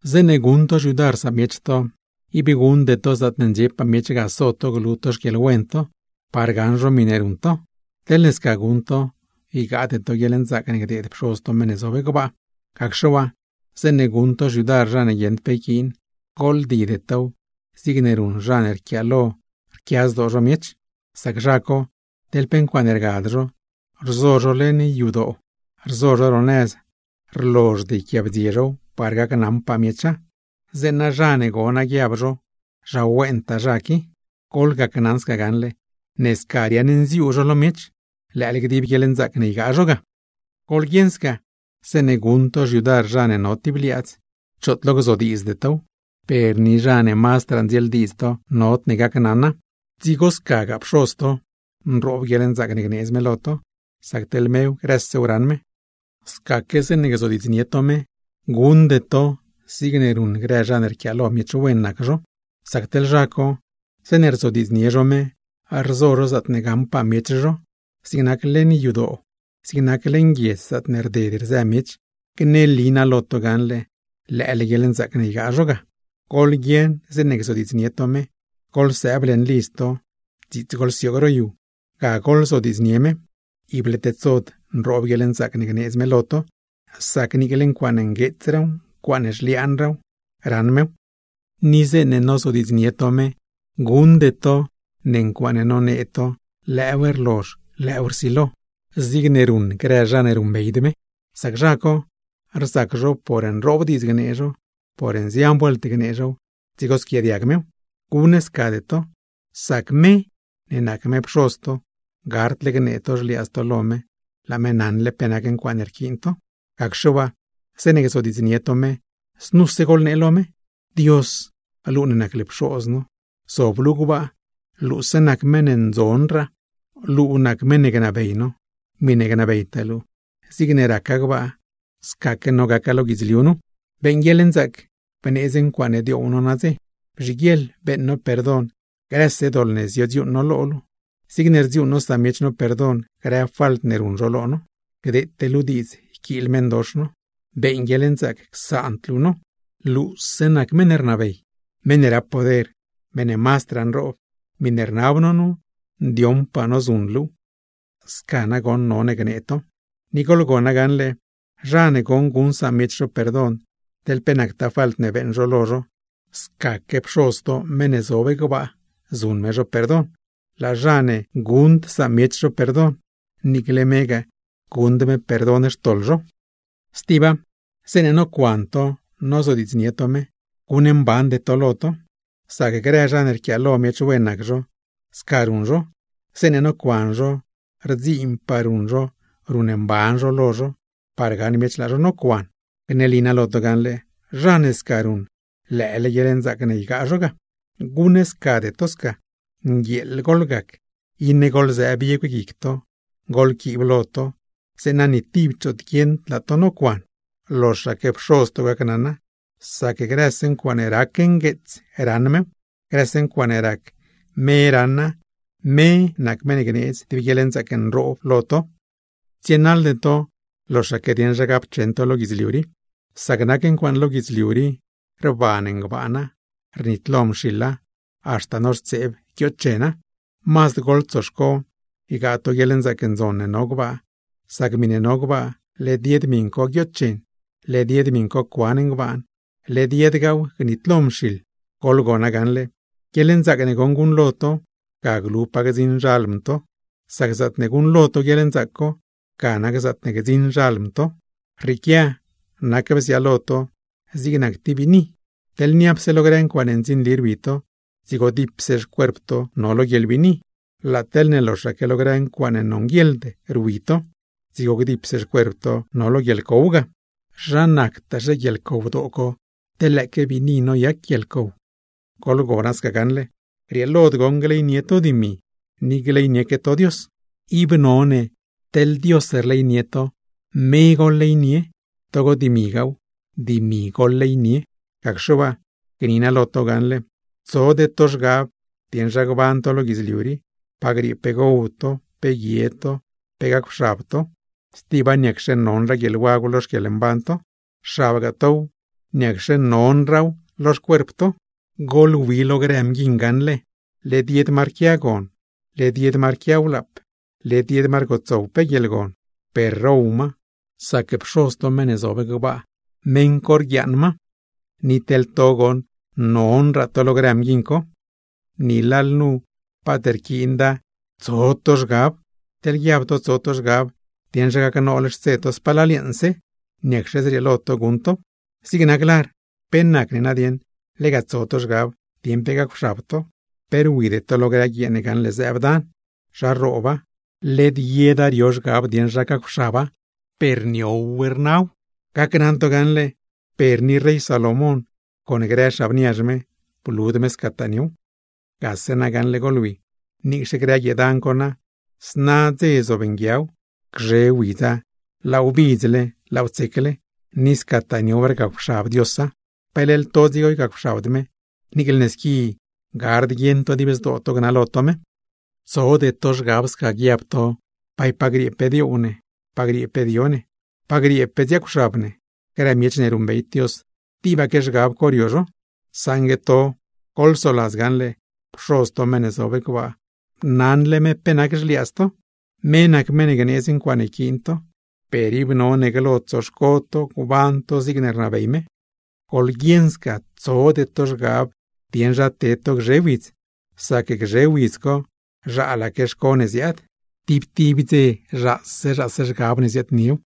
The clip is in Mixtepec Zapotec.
’Zeeṉe guṉ to xyudar samiech to, ib guṉde to zaatne ndxiepaa miech ga so to glu to xquieḻwen to, par gaṉ zho miṉe ruṉ to. Teḻne sca guṉ to, ygaade to guieḻnzaac ne gdeed Pxoz to meṉ ne zob gbaa. Gacxe waa, zeeṉe guṉ to xyudar zha ne guieṉd pe yquiin, gooḻdide tow zigne ruṉ grë zha ne rquiaalo rquia zdoo samiech; sac zha co teḻ pe ncuaaṉe rgad zho, rzo zho leṉ yadoo, rzo zho ro nëz rlozhd yquiaabdzie zhow par gacnaṉpaa miecha, zeeṉa zha ne gona guiab zho: ¡Zha wentaa zha qui! ¡Gneli naa lo to gaṉle ne sca riaṉnziuu zho lo miech, lëële gdib guieḻnzaac ne ygaa zho ga! Goḻguieṉ sca, zeeṉe guṉ to xyudar zha ne no tib liaadz, choot lo gzodiidzde tow, per ni zha ne mazdraa ndzieeldiidz to nodne gacnaṉa. Dzigo scagaa Pxoz to nroob guieḻnzaac ne gneedz me lo to, sac teḻ me grësew raṉ me. ’Scaque zeeṉe gzodiidznie to me, guṉde to zigne ruṉ grë zha ne rquiaalo miech wen nac zho. Sac teḻ zha co zeeṉe rzodiidznie zho me, rzo zho zaatne gaṉpaa miech zho, zig nac leṉ yadoo, zig nac leṉ guiedz zaatne rded rzë miech. Gneli naa lo to gaṉle lëële guieḻnzaac ne ygaa zho ga. Goḻguieṉ zeeṉe gzodiidznie to me, goḻsëëb leṉ lidz to dziits goḻsioog ro yu, ga goḻzodiidznie me. Ible tedsod nroob guieḻnzaac gneedz me lo to, sac niicle ncuaaṉe mazdraa ngueets zhliaana, raṉ mew. ’Ni zeeṉe nozodiidznie to me, guṉde to ncuaaṉe nonee to lëëw rlozh, lëëw rsilo zigne ruṉ grë zha ne ruṉbeyd me. Sac zha co rzac zho por nroob diidz gnee zho, por nzian vuelt gnee zhow dzigo squiaadiag mew. Guṉscade to, sac me ne nac me Pxoz to gardle gnee to xliaadz to lo me laa me naṉle pe nac ncuaaṉe rquiin to. Gacxe waa zeeṉe gzodiidznie to me, znu goḻnee: Dios, luu ne nac luu Pxoz no, zob luu gbaa; luuse nac meṉ ne mazdraa ndzon. Luu nac meṉ ne gnabey no, miṉe gnabeytaa luu zigne raca gbaa, scaque none gaca lo guidzliu nu. Beeṉ guieḻnzaac bneedz ncuaaṉe dioow no nadze. Bzhiguieḻ beeṉ no perdon grëse doḻ ne ziodziuuṉ no lo luu, zigne rdziuuṉ no samiech no perdon grë falt ne ruṉ zho lo no. Gdeete luu diidz yquiil meṉdox no, beeṉ guieḻnzaac bla no lo ma. Luu nac meṉ ne rnabey, meṉ ne rap poder, meṉ ne mazdraa nroob. Miṉe rnab no nu, ndioṉpaa no zuṉ luuw. ’Sca nagoṉ none gnee to. Ni goḻgona gaṉle, zha ne goṉ guṉ samiech zho perdon teḻ pe nactaa falt ne beeṉ zho lo zho, scaque Pxoz to meṉ ne zob gbaa, zuṉ me zho perdon. Zha ne guṉd samiech zho perdon, niicle megaa guṉd me perdon xtoḻ zho. ’Stiba, zeeṉe nocuan to nozodiidznie to me, guṉmbande to lo to. Sac grë zha ne rquiaalo miech wen nac zho, sca ruṉ zho; zeeṉe nocuan zho xtsiinpaa ruṉ zho ruṉmban zho lo zho par gaṉ miech laa zho nocuan. Gneli naa lo to gaṉle, zha ne sca ruṉ lëële guieḻnzaac ne ygaa zho ga. Guṉscade to, nguieeḻ goḻgac iṉe goḻzëë biegw guic to, goḻquiib lo to, zeeṉa ni tib choot guieṉd laa to nocuan, loxaque Pxoz to gacnaṉa, sac grëse ncuaaṉe rac ngueets raṉ mew. Grëse ncuaaṉe rac, me raṉa, me nac meṉ ne gneedz tib guieḻnzaac nroob lo to. ’Tsienaḻde to loxaque dieṉ zha gapcheṉ to lo guidzliu rii, sac nac ncuaaṉ lo guidzliu rii rban ngbaana, rnitlo mxiḻa, haxta noxtseeb guioochena. Mazd goḻtsoxco ygaa to guieḻnzaac ndzon ne no gbaa, sac miṉe no gbaa, led yed miṉ co guioochen, led yed miṉ co cuan ngbaan, led yedgaaw gnitlo mxiḻ. Goḻgona gaṉle, guieḻnzaac ne goṉ guṉlo to, ga glu pa gdziṉ xalm to, sac zaatne guṉlo to guieḻnzaac co ga nac zaatne gdziṉ xalm to. ’Rrieequia nac bziaalo to zig nac tib biini. Teḻne niapse lo grë ncuaaṉe ndzinli rwi to, dzigo gdipse xcuerp to no lo guieḻbiini. Laa teḻne loxaque lo grë ncuaaṉe nonguieḻd rwi to, dzigo gdipse xcuerp to no lo guieḻcow ga. ¡Zha rnazhe lo guieḻcow co, teḻ lëëque biini noyac guieḻcow! ’Goḻgona gaṉle, grieelod goṉ gleynie to dimi, ni gleynieque to Dios. Ib none teḻne Dios rleynie to, me none gleynie to, togo dimigaaw, dimi goḻleynie. ’Gacxe waa, gni naa lo to gaṉle: Tsode to zhgab dieṉ zha gban to lo guidzliu rii, pa griee pe gow to, pe guie to, pe gacwxabgaa to. Stiba, ¿niacxe mazdraa non guieḻwagw lo xquieḻmban to? Xabgaa tow, ¿niacxe mazdraa nona lo xcuerp to? Goḻwi lo grë mguiṉ gaṉle, led yed ma rquia gon, led yed ma rquia wlaap, led yed ma rgotsow pe guieḻgon, per row ma, sac Pxoz to meṉ ne zob gbaa, meṉ co rdeed ncuaaṉe row ma. ¡Teḻ to goṉ, mazdraa non to lo grë mguiṉ co! Ni lalnu paat rquiinda tant tso to zhgab. Teḻne guiab to tso to zhgab dieṉ zha gacnool xtse to spalal yeeṉse, ¿niacxe zrieelo to guṉnool tow? ’Zig nac lar, ¿pe nacne tant tso to zhgab dieṉ pe gacwxab to? Pe rwide to lo grë guiee ne gaṉle zëëb dan, zha rrooba, led yeda rio zhgab dieṉ zha gacwxaba, per niow rnaw; gni naa lo to gaṉle, per ni rey Salomón con grë xab niazh me, blud me scataa niow. ’Gase na gaṉle goḻwi, niicxe grë guiee dan co na, zna dze zob nguiaw, gzhe widz laaw bidzle, laaw tsecle, ni scataa niow rgacwxab Diosa, ¿pe leḻ to dzigo ygacwxabd me, niicle ne squi gard guieṉ to dib zdoo to gnalo to me? ’Tsode to zhgab sca guiab to: “¿Bay pa griee pe dioow ne, pa griee pe dio ne, pa griee pe dziaacwxab ne?” Grë miech ne ruṉbeyd Dios, tibaque zhgab co rio zho. Saṉgue to goḻsoladz gaṉle, Pxoz to meṉ ne zob gbaa, naṉle me pe nac grë xliaadz to, me nac meṉ ne gneedz ncuaaṉe yquiin to, per ib none glo tsoxco to gban to zigne rnabey me. Goḻguieṉ sca tsode to zhgab dieṉ zha ted to gzhe widz, sac gzhe widz co zhaalaque xco ne ziaad. Tib tib dze zhaase zhaase zhgab ne ziaadniew.